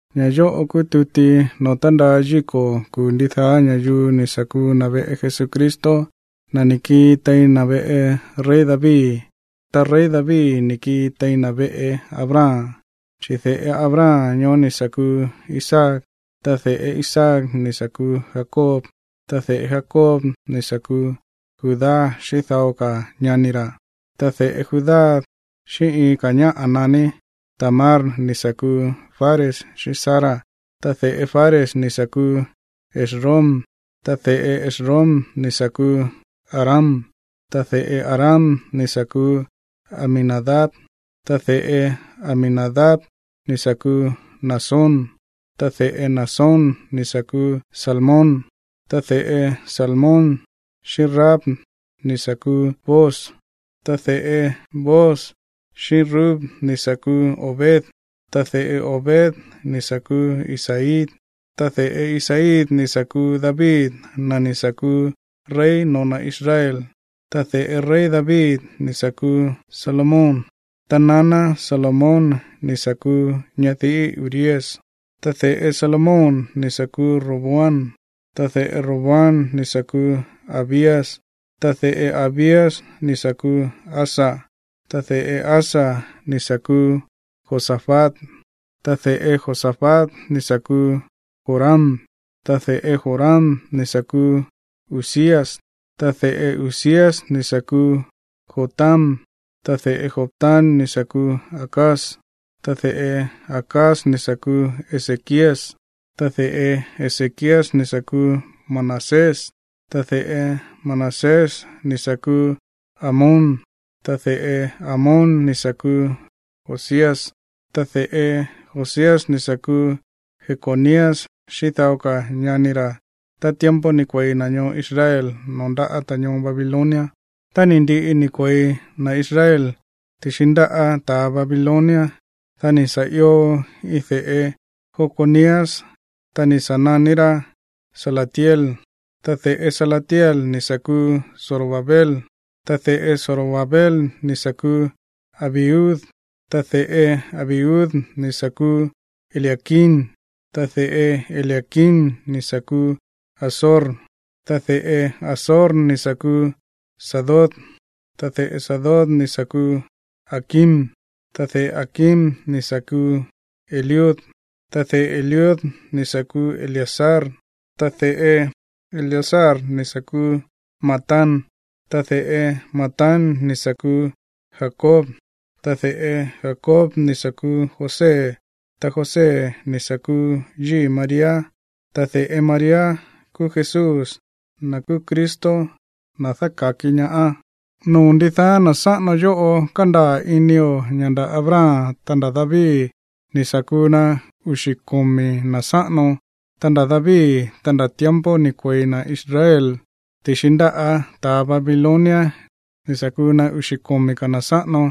Ña̱ yóꞌo kúú tuti noo̱ tándaa yíko̱ kuu̱ ndidaá ña̱yuu ni̱ sa̱ kuu na̱ veꞌe Jesucristo, na̱ ni̱ kii tein na̱ veꞌe rey David, ta rey David ni̱ kii tein na̱ veꞌe Abraham. Chi̱ de̱ꞌe Abraham ñoó ni̱ sa̱ kuu Isaac, ta de̱ꞌe Isaac ni̱ sa̱ kuu Jacob, ta de̱ꞌe Jacob ni̱ sa̱ kuu Judá xíꞌín dao ka̱ ñani ra̱. Ta de̱ꞌe Judá xíꞌín iin ñáꞌa̱ naní Tamar ni̱ sa̱ kuu Fares xíꞌín Zara, ta de̱ꞌe Fares ni̱ sa̱ kuu Esrom, ta de̱ꞌe Esrom ni̱ sa̱ kuu Aram, ta de̱ꞌe Aram ni̱ sa̱ kuu Aminadab, ta de̱ꞌe Aminadab ni̱ sa̱ kuu Naasón, ta de̱ꞌe Naasón ni̱ sa̱ kuu Salmón, ta de̱ꞌe Salmón xíꞌín Rahab ni̱ sa̱ kuu Booz, ta de̱ꞌe Booz xíꞌín Rut ni̱ sa̱ kuu Obed, ta de̱ꞌe Obed ni̱ sa̱ kuu Isaí. Ta de̱ꞌe Isaí ni̱ sa̱ kuu David, na̱ ni̱ sa̱ kuu rey no̱ó na̱ Israel, ta de̱ꞌe rey David ni̱ sa̱ kuu Salomón, ta naná Salomón ni̱ sa̱ kuu ñadiꞌí Urías. Ta de̱ꞌe Salomón ni̱ sa̱ kuu Roboam, ta de̱ꞌe Roboam ni̱ sa̱ kuu Abías, ta de̱ꞌe Abías ni̱ sa̱ kuu Asa, ta de̱ꞌe Asa ni̱ sa̱ kuu Josafat, ta de̱ꞌe Josafat ni̱ sa̱ kuu Joram, ta de̱ꞌe Joram ni̱ sa̱ kuu Uzías, ta de̱ꞌe Uzías ni̱ sa̱ kuu Jotam, ta de̱ꞌe Jotam ni̱ sa̱ kuu Acaz, ta de̱ꞌe Acaz ni̱ sa̱ kuu Ezequías, ta de̱ꞌe Ezequías ni̱ sa̱ kuu Manasés, ta de̱ꞌe Manasés ni̱ sa̱ kuu Amón, ta de̱ꞌe Amón ni̱ sa̱ kuu Josías, ta de̱ꞌe Josías ni̱ sa̱ kuu Jeconías xíꞌín dao ka̱ ñani ra̱ tá tiempo ni̱ kue̱i na̱ ñoo Israel noo̱ ndáꞌa̱ ta̱ ñoo Babilonia. Tá ni̱ ndiꞌi ni̱ kue̱i na̱ Israel ti̱xi ndáꞌa̱ ta̱ Babilonia, dá ni̱ sa̱ io iin de̱ꞌe Jeconías ñoó, ta ni̱ sa̱ naní rá Salatiel, ta de̱ꞌe Salatiel ni̱ sa̱ kuu Zorobabel, ta de̱ꞌe Zorobabel ni̱ sa̱ kuu Abiud, ta de̱ꞌe Abiud ni̱ sa̱ kuu Eliaquim, ta de̱ꞌe Eliaquim ni̱ sa̱ kuu Azor, ta de̱ꞌe Azor ni̱ sa̱ kuu Sadoc, ta de̱ꞌe Sadoc ni̱ sa̱ kuu Aquim, ta de̱ꞌe Aquim ni̱ sa̱ kuu Eliud, ta de̱ꞌe Eliud ni̱ sa̱ kuu Eleazar, ta de̱ꞌe Eleazar ni̱ sa̱ kuu Matán, ta de̱ꞌe Matán ni̱ sa̱ kuu Jacob, ta de̱ꞌe Jacob ni̱ sa̱ kuu José, ta José ni̱ sa̱ kuu yíi̱ María, ta de̱ꞌe María kúú Jesús, na̱ kúú Cristo, na̱ dáka̱ki ñaá. Noo̱ ndidaá na̱ sáꞌano yóꞌo, kándaa̱ inio̱ ña̱ nda̱ Abraham, ta nda̱ David ni̱ sa̱ kuu na uxi̱ komi̱ na̱ sáꞌano. Ta nda̱ David, ta nda̱ tiempo ni̱ kue̱i na̱ Israel ti̱xi ndáꞌa̱ ta̱ Babilonia, ni̱ sa̱ kuu na uxi̱ komi̱ ka̱ na̱ sáꞌano.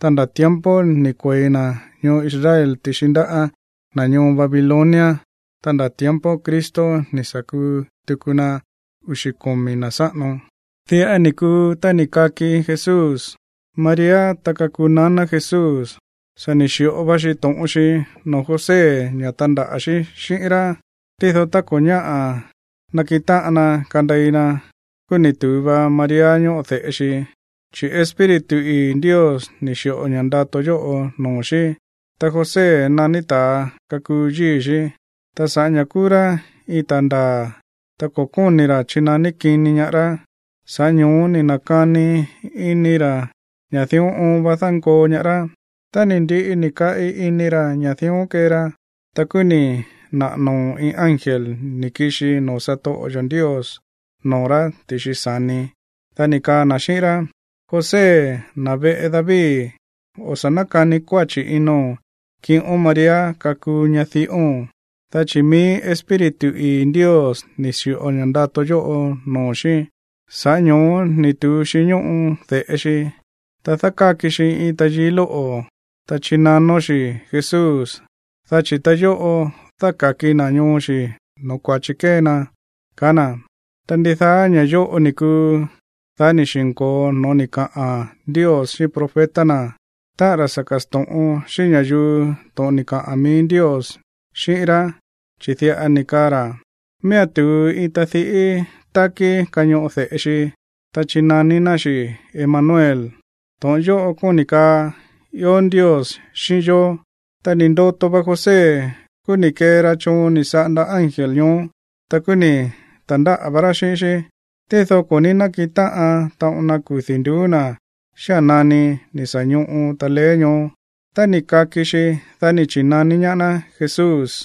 Ta nda̱ tiempo ni̱ kue̱i na̱ ñoo Israel ti̱xi ndáꞌa̱ na̱ ñoo Babilonia, ta nda̱ tiempo Cristo ni̱ sa̱ kuu tuku na uxi̱ komi̱ na̱ sáꞌano. Diꞌa ni̱ kuu tá ni̱ kaki Jesús: María, ta kakuu naná Jesús, sa̱ ni̱ xi̱ꞌo va xi to̱ꞌon xi noo̱ José ña̱ tandaꞌa̱ xí xíꞌín rá. Tído tá ko̱ ñáꞌa̱ nakiꞌin táꞌan na kandei na, kúú ni̱ tu̱u va María ñóꞌo de̱ꞌe xi, chi̱ Espíritu ii̱ Ndios ni̱ xi̱ꞌo ña̱ ndato yóꞌo noo̱ xí. Ta José naní ta̱a kakuu yíi̱ xí, ta sa̱ꞌá ña̱ kúú rá iin ta̱a ndaa̱, ta ko̱ kóni̱ ra̱ chinaní kini ñaá rá, sa̱ꞌá ño̱ó ni̱ na̱kani ini ra̱ ña̱ dión oon va dánkoo ñaá rá. Tá ni̱ ndiꞌi ni̱ kaꞌi ini ra̱ ña̱ dión kee ra, ta kúú ni̱ naꞌa̱ noo̱ iin ángel ni̱ kixi noo̱ satoꞌo yo̱ Ndios noo̱ rá ti̱xi sa̱ni. Dá ni̱ kaa na̱ xíꞌín rá: ―José, na̱ veꞌe David, o̱ sa̱ nákani kuáchi̱ ino̱n kiꞌón María kakuu ñadiꞌóo̱n, dá chi̱ mií Espíritu ii̱ Ndios ni̱ xi̱ꞌo ña̱ꞌa ndato yóꞌo noo̱ xí, sa̱ꞌá ño̱ó ni̱ tu̱u xi ñóꞌo de̱ꞌe xi. Ta dákáki xi iin tayií lóꞌo̱, ta chinanón xi̱ Jesús, dá chi̱ ta yóꞌo dáka̱ki na̱ ñoo xi̱ no̱ó kua̱chi kée na ―kaá na̱. Ta ndidaá ña̱ yóꞌo ni̱ kuu, dá ni̱ xi̱nko̱o noo̱ ni̱ kaꞌa̱n Ndios xíꞌín profeta, táꞌa̱n na̱ sa̱ ka̱sto̱ꞌon xíꞌín ña̱yuu to̱ꞌon ni̱ kaꞌa̱n mií Ndios xíꞌín ná, chi̱ diꞌa ni̱ kaa na̱: Miía̱n tu̱u iin tadiꞌí tákí kañoꞌo de̱ꞌe xi. Ta chinaní ná xi̱ Emanuel. To̱ꞌon yóꞌo kóni̱ kaa: Ió Ndios xíꞌín yó. Tá ni̱ ndoto va José, kúú ni̱ kee ra choon ni̱ saꞌanda ángel ñoó. Ta kúú ni̱ ta̱ndáꞌa̱ vá rá xíꞌín xí. Tído ko̱ ní nákiꞌin táꞌan taꞌon na kudi̱ nduú na̱ xía̱n nani ni̱ sa̱ ñoꞌo taleé ñoó. Tá ni̱ kaki xi, dá ni̱ chi̱naní ñaá ná Jesús.